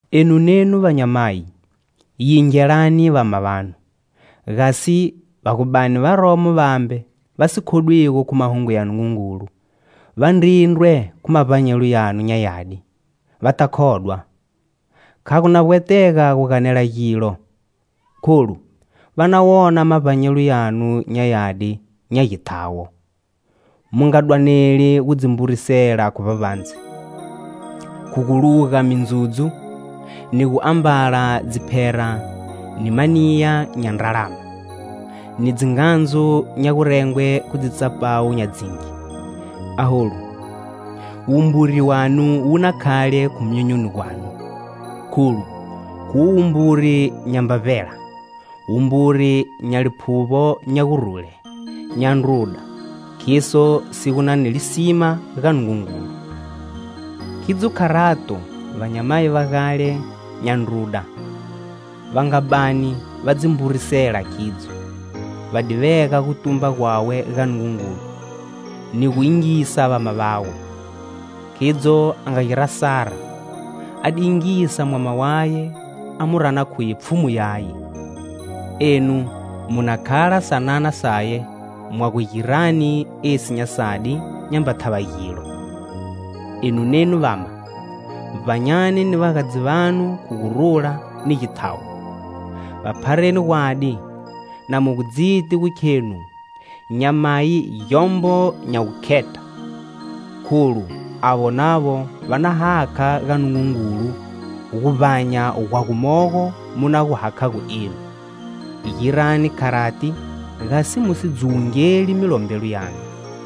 Enu nenu vanyamayi, yingelani vama vanu, gasi va gu bani varomo vambe va si khodwigo khu Mahungu ya Nungungulu, va ndrindrwe khu mavbanyelo yanu nya yadi, va ta khodwa. Kha gu na vbwetega gu ganela gilo, kholu va na wona mavbanyelo yanu nya yadi nya githawo. Mu nga dwaneli gu dzi mburisela khu vbavbandze, khu gu luga mindzudzu, ni guambala dziphera ni maniya nya ndralama, ni dzingandzu nya gurengwe khu dzitsapawu nya dzingi. Aholu, wumburi wanu wu na khale khu myonyoni gwanu, kholu, khuwo wumbiri nyamba vbela, wumburi nya liphuvbo nya gurule, nya ndruda, khiso si gu na ni lisima ga Nungungulu. Khidzo kharato, vanyamayi va gale nya ndruda va nga bani va dzi mburisela khidzo, va di vega gutumba gwawe ga Nungungulu, ni gu yingisa vama vawe. Khidzo a nga gira Sara; a di yingisa mwama waye a mu rana khuye pfhumu yaye. Enu mu na khala sanana saye mwa gu girani esi nya sadi nyamba thava gilo. Enu nenu vama, vbanyani ni vagadzi vanu khu gurula ni githawo. Va phareni gwadi na mu gu dziti gu khenu nyamayi gyombo nya wukheta. Kholu avo navo va na hakha ga Nungungulu guvbanya gwa gumogo mu na gu hakhago nenu. Girani kharati gasi mu si dzuwungeli milombelo yanu.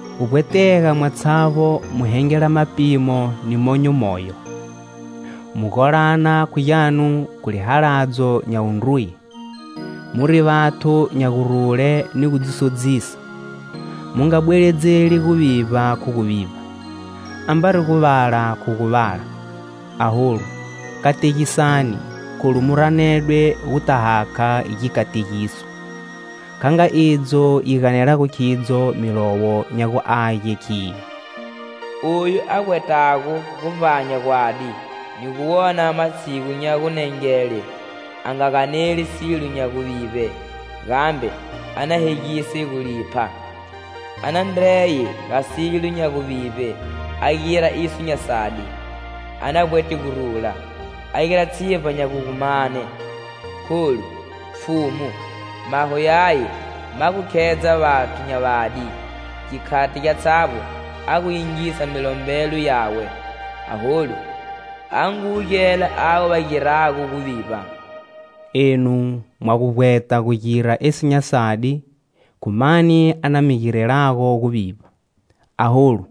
Gu vbwetega mwatshavbo mu hengela mapimo ni monyo moyo, mu golana khu gyanu khu lihaladzo nya wundruye, muri vathu nya gurule ni gu dzi sodzisa. Mu nga bweledzeli guvivba khu guvivba, ambari guvala khu guvala. Aholu kategisani kholu mu ranedwe guta hakha gikategiso. Kha nga idzo yi ganelago khidzo Milowo nya gu Age khiyo: "Oyu a vbwetago gu vbanya gwadi,ni gu wona matshigu nya gunengele,a nga ganeli silo nya guvivbe,gambe a na hegise gulipha. A na ndreye ga silo nya guvivbe,a gira iso nya sadi; a na vbwete gurula, a gira tshivba nya gu gu mane. Kholu, Pfhumu, maho yaye ma gu khedza vathu nya vadi;gikhati gyatshavbo a gu yingisa milombelo yawe.Aholu, a ngu wugela avo va girago guvivba." Enu, mwa gu vbweta gu gira esi nya sadi, khu mani a na mi girelago guvivba? Aholu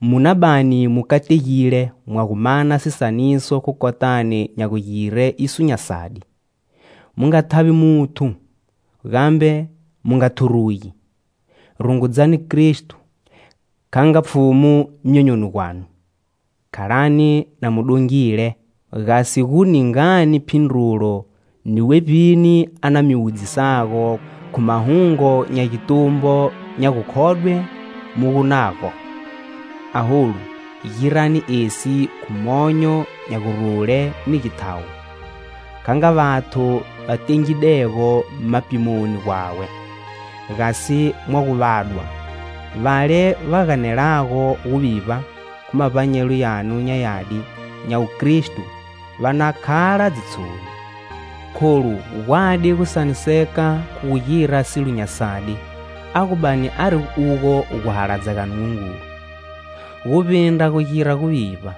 mu na bani mu kategile mwa gu mana sisaniso khu kotani nya gugire iso nya sadi. Mu nga thavi muthu, gambe mu nga thurugi. Rungudzani Kristo kha nga Pfhumu myonyoni gwanu, khalani na mu dongile gasi gu ningani phindrulo ni wevbini a na gu mi wudzisago khu mahungu nya gitumbo nya gukhodwe mu gu nago. Aholu, girani esi khu monyo nya gurule ni githawo, kha nga vathu va tengidego mapimoni gwawe, gasi mwa gu vadwa, vale va ganelago guvivba khu mavbanyelo yanu nya yadi nya wukristo, va na khala dzitshoni. Kholu, gwadi gusaniseka khu gu gira silo nya sadi, a gu bani ari ugo guhaladza ga Nungungulu, guvbindra gu gira guvivba.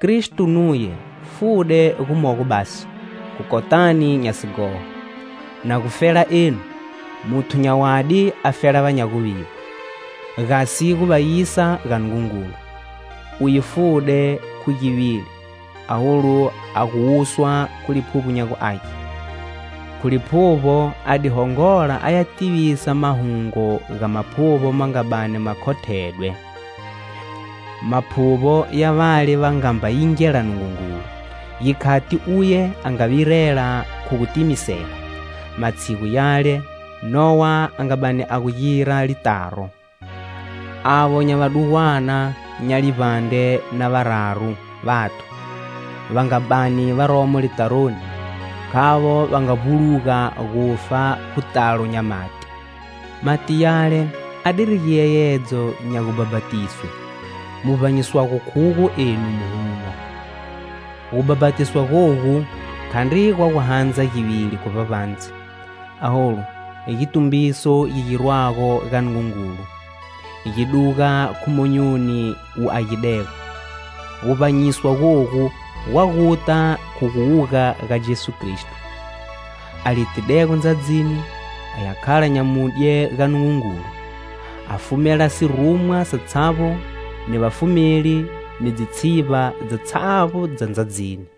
Kristo nuye fude gumogo basi khu kotani nya sighoho, na gufela enu. Muthu nya wadi afela va nya guvivba, gasi gu va yisa ga Nungungulu. Uye fude khu givili, aholu a gu wuswa khu Liphuvbo nya gu Age. Khu Liphuvbo a di hongola aya tivisa Mahungu ga maphuvbo ma nga bani ma khothedwe. Maphuvbo ya vale va nga mba yingela Nungungulu, gikhati uye a nga virela khu gu timisela, matshigu yale Nowa a nga bani a gu gira litaro. Avo nya vadugwana, nya livbandre na vararu vathu, va nga bani varomo litaroni, khavo va nga vbuluga gufa khu talo nya mati. Mati yale a diri giyeyedzo nya gubhapatiswe, mu vbanyiswago khugo enu, muhuno. Gubhapatiswa gogu khandri gwa gu handza givili khu vbavbandze, aholu, gitumbiso gi girwago ga Nungungulu, gi duga khu monyoni wu agidego. Guvbanyiswa gogu gwa guta khu guwuga ga Jesu Kristo. A litidego ndzadzini aya khala nyamudye ga Nungungulu, a fumela sirumwa satshavbo ni vafumeli ni dzitshivba dzatshavbo dza ndzadzini.